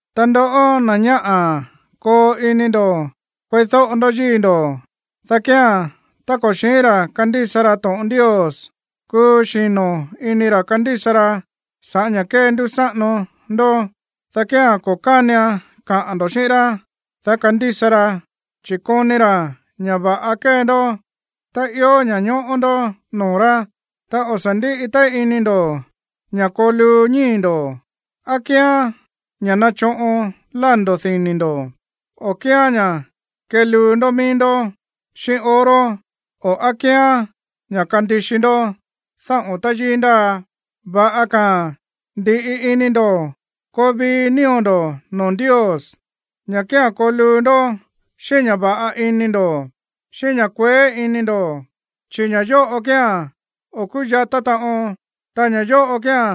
Ta ndoꞌó, na̱ ñáꞌa̱, koo ini ndo̱ kueídóꞌo ndó yíi̱ ndo̱, dá kía̱n, tá ko̱ xi̱ín ra̱ kandísa ra to̱ꞌon Ndios, kúú xino̱ ini ra̱ kandísa raa̱n sa̱ꞌá ña̱ kéndúsáꞌano ndó, dá kía̱n ko̱ kánian kaꞌa̱n ndo̱ xíꞌín rá, dá kandísa raa̱n, chi̱ koni ra̱ ña̱ va̱ꞌa kée ndó, ta ió ña̱ñóꞌó ndó noo̱ rá. Ta o̱ sa̱ ndíꞌi téí ini ndo̱ ña̱ koo luu ñíi̱ ndo̱, á kíán ña̱ nachoꞌon lándo̱ dini̱ ndo̱, o á kíán ña̱ keluu ndó mií ndó xíꞌín oro, o á kíán ña̱ kandixi ndó dáꞌo̱n táyíí ndáa. Va̱ꞌa ka̱a̱n ndi̱ꞌi ini ndo̱ koo vii nío̱ ndo̱ noo̱ Ndios, ña̱ kía̱n koo luu ndó xíꞌín ña̱ va̱ꞌa ini ndo̱, xíꞌín ña̱ kueé ini ndo̱, chi̱ ña̱ yóꞌo kía̱n o̱ kúyatá taꞌon, ta ña̱ yóꞌo kía̱n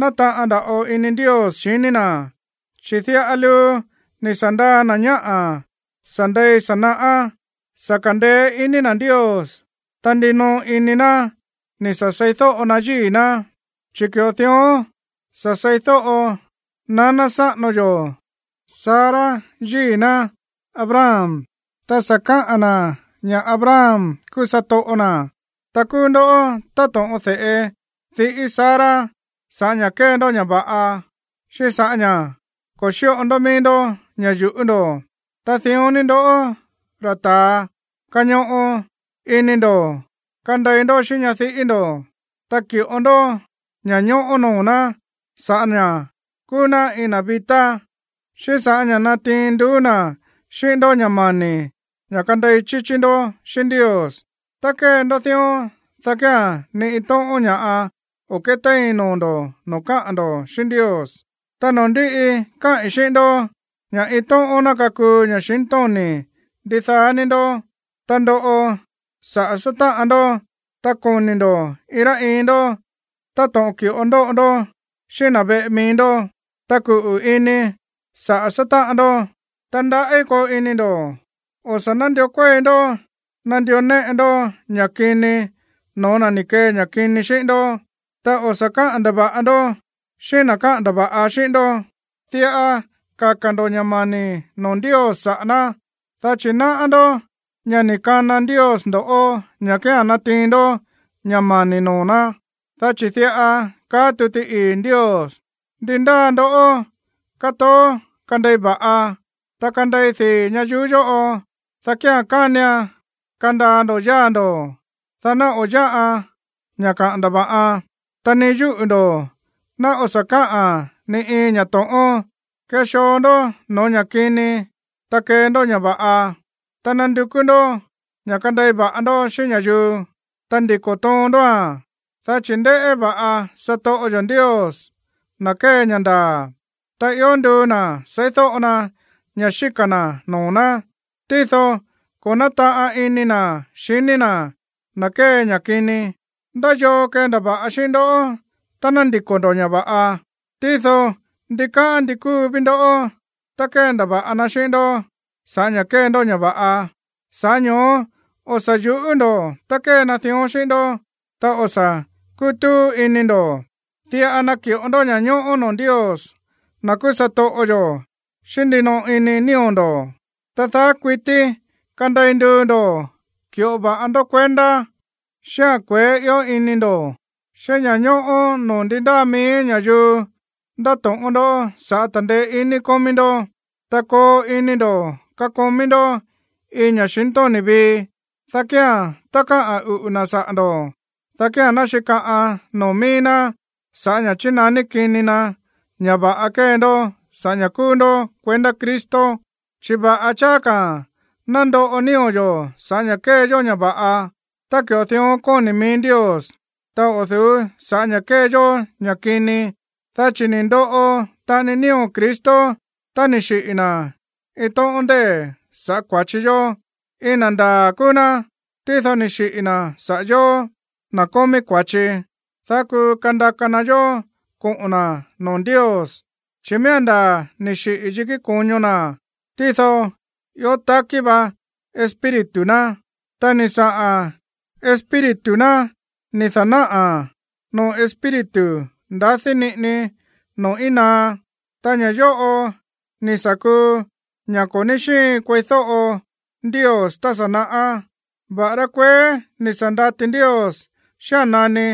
nátaꞌan nda̱ꞌo ini Ndios xiní na̱. Chi̱ diꞌa luu ni̱ sa̱ ndaa na̱ ñáꞌa̱ sa̱ ndei sa̱ naꞌá, sa̱ ka̱ndeé iní na̱ Ndios, ta ndinoꞌo ini na̱ ni̱ sa̱ seídóꞌo ná yíi̱ ná. Chi̱ ki̱ꞌo dión sa̱ seídóꞌo naná sáꞌano yó Sara yíi̱ ná Abraham, ta sa̱ káꞌa̱n na̱ ña̱ Abraham kúú satoꞌo na̱. Ta kúú ndó táto̱ꞌon de̱ꞌe diꞌí Sara sa̱ꞌá ña̱ kée ndó ña̱ va̱ꞌa, xíꞌín sa̱ꞌá ña̱ ko̱ xíꞌo ndó mií ndó ña̱ yu̱ꞌú ndo̱. Ta dión ni ndoꞌó, ra̱ ta̱a, kañoꞌo ini ndo̱ kandei ndó xíꞌín ñadiꞌí ndo̱. Ta ki̱ꞌo ndó ña̱ñóꞌó noo̱ ná sa̱ꞌá ña̱ kúú ná iin na̱ vi̱tá, xíꞌín sa̱ꞌá ña̱ natiin nduú na̱ xíꞌín ndó ña̱ mani̱ ña̱ kandei chíchí ndó xíꞌín Ndios. Tá kée ndó dión, dá kía̱n ni iin tóꞌón ña̱ꞌa o̱ kétéin noo̱ ndo̱ noo̱ káꞌa̱n ndo̱ xíꞌín Ndios. Ta noo̱ ndíꞌi, káꞌi̱n xíꞌín ndó ña̱ iin tóꞌón ná kakuu ña̱xintóni̱ ndidaá ní ndó, ta ndoꞌo saꞌa̱ sátáꞌan ndó, ta koni̱ ndo̱ iin rá iin ndó táto̱ꞌon ki̱ꞌo ndóꞌo ndó xíꞌín na̱ veꞌe mií ndó, ta kuꞌu̱ ini saꞌa̱ sátáꞌan ndó, ta ndaꞌí koo ini ndo̱. O̱ sa̱ nándió kuéi ndó nandió néꞌe ndó ña̱ kini no̱ó na̱ ni̱ kee ña̱ kini xíꞌín ndó. Ta o̱ sa̱ káꞌa̱n ndava̱ꞌa ndó xíꞌín na̱ káꞌa̱n ndava̱ꞌa xíꞌín ndó. Diꞌa kaka̱ ndo̱ ña̱ mani̱ noo̱ Ndios saꞌa̱ ná, dá chi̱ náꞌá ndó ña̱ ni̱ kana Ndios ndo̱ꞌó ña̱ kía̱n natiin ndó ña̱ mani̱ noo̱ ná. Dá chi̱ diꞌa kaá tuti ii̱ Ndios: Ndi ndáa ndoꞌó katoó kandei va̱ꞌa, ta kandei dii̱ ñayuú yóꞌo, dá kía̱n kánian kandaa ndo̱ yáa̱ ndo̱, dá ná o̱ yáꞌa ña̱ kaꞌa̱n ndava̱ꞌan, ta ni yúꞌu̱ ndo̱ ná o̱ sa̱ káꞌa̱n ni iin ña̱ to̱ꞌón. Kexoo ndó no̱ó ña̱ kini, ta kee ndó ña̱ va̱ꞌa. Ta nandukú ndó ña̱ kandei va̱ꞌa ndó xíꞌín ña̱yuu, ta ndiko̱ toon ndóa̱n. Dá chi̱ ndéꞌé va̱ꞌa satoꞌo yo̱ Ndios na̱ kée ña̱ ndaa̱, ta ió nduu na̱ seídóꞌo na ña̱ xíka̱ na̱ noo̱ ná. Tído ko̱ nátaꞌan ini na̱ xiní na̱ na̱ kée ña̱ kini. ¿Ndá yoo kendava̱ꞌa xíꞌín ndó tá ná ndiko̱ ndo̱ ña̱ va̱ꞌa? Tído ndikáꞌán ndi kúu ví ndó tá kéndava̱ꞌa na xíꞌín ndó sa̱ꞌá ña̱ kée ndó ña̱ va̱ꞌa. Sa̱ꞌá ño̱ó o̱ sa̱ yu̱ꞌú ndo̱ tá kée na dión xíꞌín ndó, ta o̱ sa̱ kútúú ini ndo̱. Diꞌa naki̱ꞌo ndó ña̱ñóꞌó noo̱ Ndios, na̱ kúú satoꞌo yo̱, xíꞌín ndinoꞌo ini nío̱ ndo̱. Ta daá kuití kandei nduu ndo̱ ki̱ꞌo va̱ꞌa ndó kuendá xíꞌa̱n kueé ió ini ndo̱, xíꞌín ña̱ñóꞌó noo̱ ndi ndáa mií ña̱yuu ndato̱ꞌón ndoꞌó sa̱ꞌá ta̱ndeé iní kómí ndó. Ta koo ini ndo̱ kakomí ndó iin ña̱xintóni̱ vii, dá kía̱n tá káꞌa̱n uꞌu̱ na̱ saꞌa̱ ndo̱ꞌó, dá kía̱n ná xíkaꞌan noo̱ mií ná sa̱ꞌá ña̱ chínaní kini na ña̱ va̱ꞌa kée ndó sa̱ꞌá ña̱ kúú ndó kuendá Cristo. Chi̱ va̱ꞌa cháá ka̱ ná ndoꞌo nío̱ yo̱ sa̱ꞌá ña̱ kée yó ña̱ va̱ꞌa, tá ki̱ꞌo dión kóni̱ mií Ndios, ta o̱ du̱ú sa̱ꞌá ña̱ kée yó ña̱ kini. Dá chi̱ ni̱ ndoꞌo taꞌani nío̱ Cristo tá ni̱ xiꞌi̱ na̱ iin tóꞌón ndée̱ sa̱ꞌá kua̱chi yó. Iin na̱ ndaa̱ kúú ná, tído ni̱ xiꞌi̱ na̱ saꞌa̱ yóó, na̱ kómí kua̱chi, dá kuu kandaka na yó koꞌo̱n na̱ noo̱ Ndios. Chi̱ miía̱n ndaa̱ ni̱ xiꞌi̱ yikí ko̱ño na̱, tído ió takí va Espíritu ná. Ta ni̱ saꞌa̱n Espíritu ná ni̱ da̱náꞌa̱ na̱ noo̱ espíritu ndadí niꞌini noo̱ íin naá, ta ña̱ yóꞌo ni̱ sa̱ kuu ña̱ ko̱ ní xíin kueídóꞌo Ndios tá sa̱ naꞌá, va̱ꞌará kueé ni̱ sa̱ ndati Ndios xía̱n nani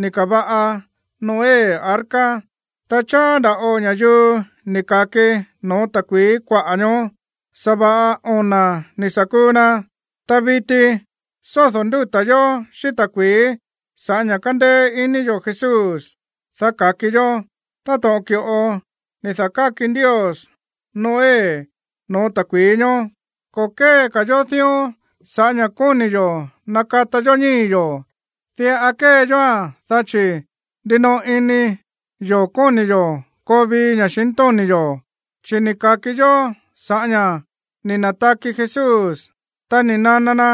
ni̱ ka̱va̱ꞌa Noé arca. Ta cháá nda̱ꞌo ña̱yuu ni̱ ka̱ki no̱ó ta̱kui̱í kuaꞌa̱ ñoó. Sa̱va̱ꞌa ona̱ ni̱ sa̱ kuu na. Ta viti sódo̱ ndúta̱ yo̱ xíꞌín ta̱kui̱í sa̱ꞌá ña̱ kándéé iní yo̱ Jesús, dá ka̱ki yó, táto̱ꞌon ki̱ꞌo ni̱ da̱káki Ndios Noé no̱ó ta̱kui̱í ñoó. Ko̱ kée yó dión sa̱ꞌá ña̱ kóni̱ yo̱ nakata yó ñíi̱ yo̱, diꞌa kée yóa̱n dá chi̱ ndinoꞌo ini yo̱ kóni̱ yo̱ koo vii ña̱xintóni̱ yo̱, chi̱ ni̱ ka̱ki yó sa̱ꞌá ña̱ ni̱ na̱taki Jesús. Ta ni̱ nana na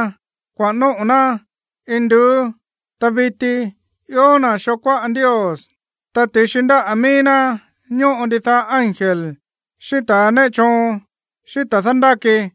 kuaꞌa̱n nóꞌo̱ ná induú. Ta viti ió na̱ xoo kuáꞌa Ndios. Ta ti̱xi ndáꞌa̱ míí ná ñóꞌo ndidaá ángel, xíꞌín ta̱ néꞌe choon, xíꞌín ta̱ dándáki.